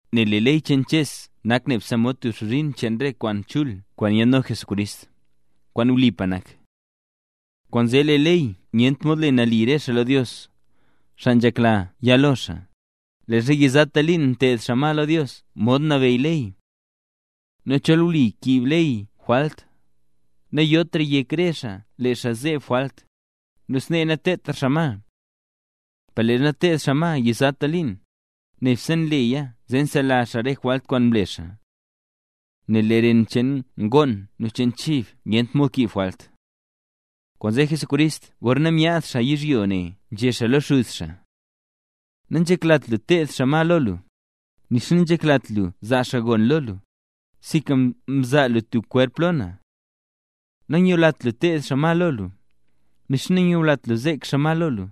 Nel lee ley cheen Ches nak nebse mod tub xbzhin cheen re kwaan chul kwaan yaadno Jesucrist, kwaan wlipa nak. Kwaanzee lee ley nyent mod le nali re xaa lo Dios, xaa nzhekla ya lo xaa, leezha yizata liin nteed xaa ma lo Dios modxa nabeyy ley. Nu chol wlipa nkiib ley jwalt, nayotra yek re xaa lee xaa nzeb jwalt, nu snee nateedtra xaa ma. Per leezha nteed xaa ma yizata liin, nebse nleya zee nselazh xaa re jwalt kwaan mle xaa. Nel lee ren cheen ngoon nu cheen chib nyent mod kiib jwalt. Kwaanzee Jesucrist gorna myaad xaa yizhyo ne nzhé xaa lo Xuz xaa: Nanzheklat lu teed xaa ma lo lu, nixa nanzheklat lu zaa xaa gon lo lu, sinka mzaa lu tub kwerp lo na. Nanyulat lu teed xaa ma lo lu, nixa nanyulat lu zek xaa ma lo lu,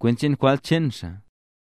kwent cheen jwalt cheen xaa.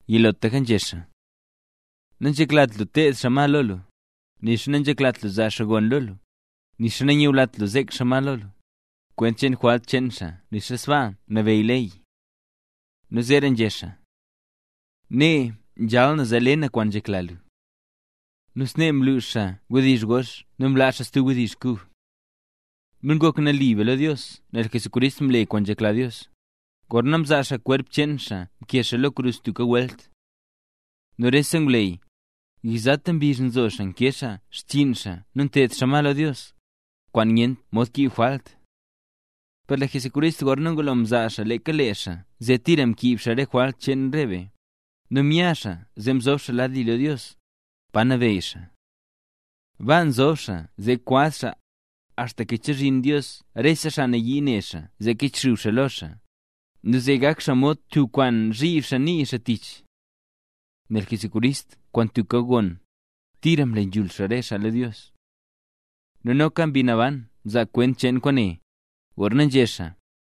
Yilotlaka nzhé xaa: “Nanzheklat lu teed xaa ma lo lu, nixa nanzheklat lu zaa xaa gon lo lu, nixa nanyulat lu zek xaa ma lo lu”, kwent cheen jwalt cheen xaa nixa sbaa nabeyy ley. Nu zeera nzhé xaa: “Nee nzhal na zee le na kwaan nzhekla lu”. Nu snee mlux xaa wdizh gox nu mlaa xaa stub wdizh kub. Nu ngok nali be lo Dios nel Jesucrist mle kwaan nzhekla Dios, gorna mzaa xaa kwerp cheen xaa mkee lo krus tubka welt. Nu rese ngwleyy, yizata mbizh nzo xaa nkee xaa xchiin xaa nu nteed xaa ma lo Dios, kwaan nyent mod kiib jwalt. Per lee Jesucrist gorna ngulo mzaa xaa leeka lee xaa zee tira mkiib xaa rese jwalt cheen re be, nu mya xaa zee mzob xaa lad li lo Dios, pa nabeyy xaa. Baa nzob xaa zee kwaz xaa, axtaka chezhin Dios rese xaa nayii ne xaa zee kichxub xaa lo xaa, nu zee gak xaa mod tub kwaan zhib xaa nii xaa tich. Nel Jesucrist kwaan tubka gon, tira mle nzhul xaa re xaa Dios. Nu noka Mbi Naban mzaa kwent cheen kwaane, gorna nzhé xaa: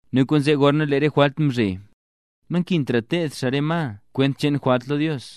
Nu kwaanzee gorna lee re jwalt mzhe, nankintra teed xaa re ma kwent cheen jwalt lo Dios.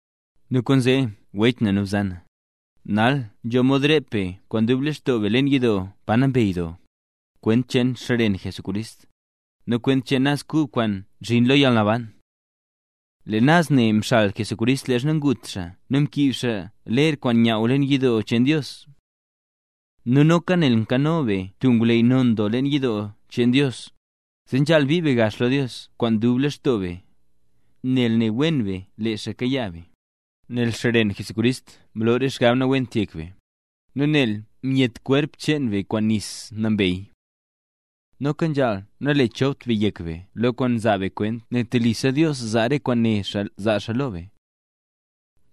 Nu kwaanzee wech nu bzan, nal nzho mod rep be kwaan dub lextoo be leen yidoo Pa Nambey Doo, kwent cheen xren Jesucrist, nu kwent cheen naz kub kwaan nzhin lo yalnaban. Lee naz ne mxal Jesucrist leezha ngut xaa nu mkiib xaa ler kwaan nyaaw leen yidoo cheen Dios. Nu noka nel nkano be tub ngwleyy non doo leen yidoo cheen Dios; zee nzhaal bii be gax lo Dios kwaan dub lextoo be, nel ne wen be lee xaa kayaa be, nel xren Jesucrist mloo re xgab nawent yek be, nu nel myetla kwerp cheen be kwaan nis nambey. Noka nzhaal nalechopt be yek be lo re kwaan nzaa be kwent nel telisa Dios zaa re kwaan né xaa zaa xaa lo be.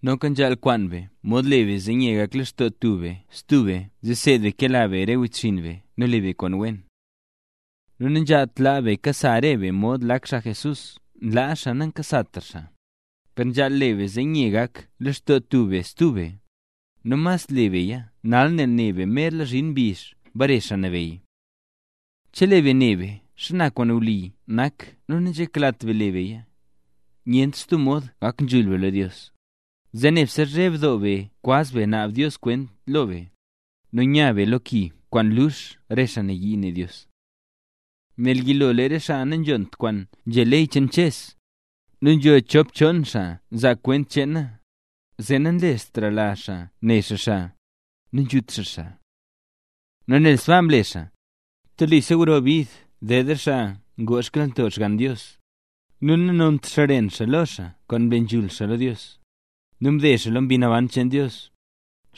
Noka nzhaal kwaan be mod le be zee nye gak lextoo tub be stub be zee seed be kela be re wechxinn be nu le be kwaan wen. Nu nanzhaalt laa be kasa re be mod lak xaa Jesús nlaa xaa nankasatra xaa, per nzhaal le be zee nye gak lextoo tub be stub be, nu mas le beya nal nel ne be merla zhin mbizh bare Xaa Nabeyy. Chelee be ne be xana kwaan wli nak nu nanzheklat be le beya, nyentra stub mod ngak nzhul be lo Dios; zee nebse nzheb doo be kwaz be naab Dios kwent lo be, nu nya be lo ki kwaan lux re xaa nayii ne Dios. Nel yilo lee re xaa nanzhont kwaan nzhé ley cheen Ches, nu nzho chop chon xaa nzaa xaa kwent cheena, zee nanlestrala xaa ne xaa xaa, nu nzhut xaa xaa. Nu nel sbaa mle xaa, ¡telisa grora bid ded re xaa kwaan ngoo xkyalnto Xgann Dios, nu nanont xren xaa lo xaa kwaan mle nzhul xaa lo Dios, nu mde xaa lo Mbi Naban cheen Dios,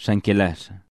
xaa nkela xaa!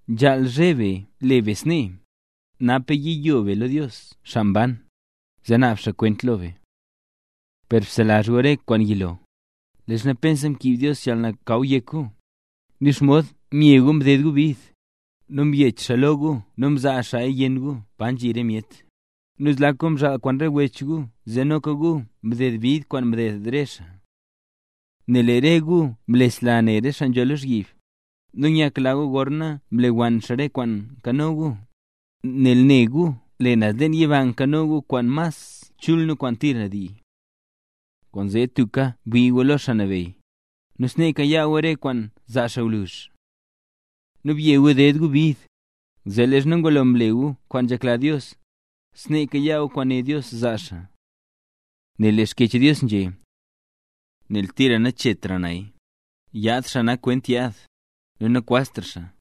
¡Nzhaal zheb be le be snee, napaka yiyo be lo Dios xaa mban, zee naab xaa kwent lo be! Per bselazh gu re kwaan yilo, leezha pensa mkiib Dios yalnakaw yek gu, nu xomod mye gu mded gu bid, nu mbyech xaa lo gu nu mzaa xaaya yenn gu pa nzhi re myet, nu zlak gu mzhaal kwaan re wech gu zee noka gu mded bid kwaan mded re xaa. Nel lee re gu mlesla ne re xaa nzho lozhyib, nu nyakla gu gorna mlewann xaa re kwaan nkano gu, nel nela gu lee naz yiba nkano gu kwaan mas chul nu kwaan tira ndii. Kwaanzee tubka bwii gu lo Xaa Nabeyy, nu snee kayaa gu re kwaan zaa xaa gwluzh. Nu bye gu ded gu bid, zee leezha ngulo mle gu kwaan nzhekla Dios, snee kayaa gu kwaan né Dios zaa xaa. Nel lee Xkyech Dios nzhé: Nel tira naxchetra naya, yaad xaa nak kwent yaad, nu nakwaztra xaa.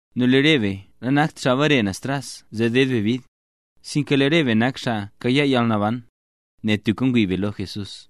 Nu lee re be nanakt xaa mbare naz tras zee deed be bid, sinka lee re be nak xaa kayaa yalnaban, nel tubka ngwii be lo Jesús.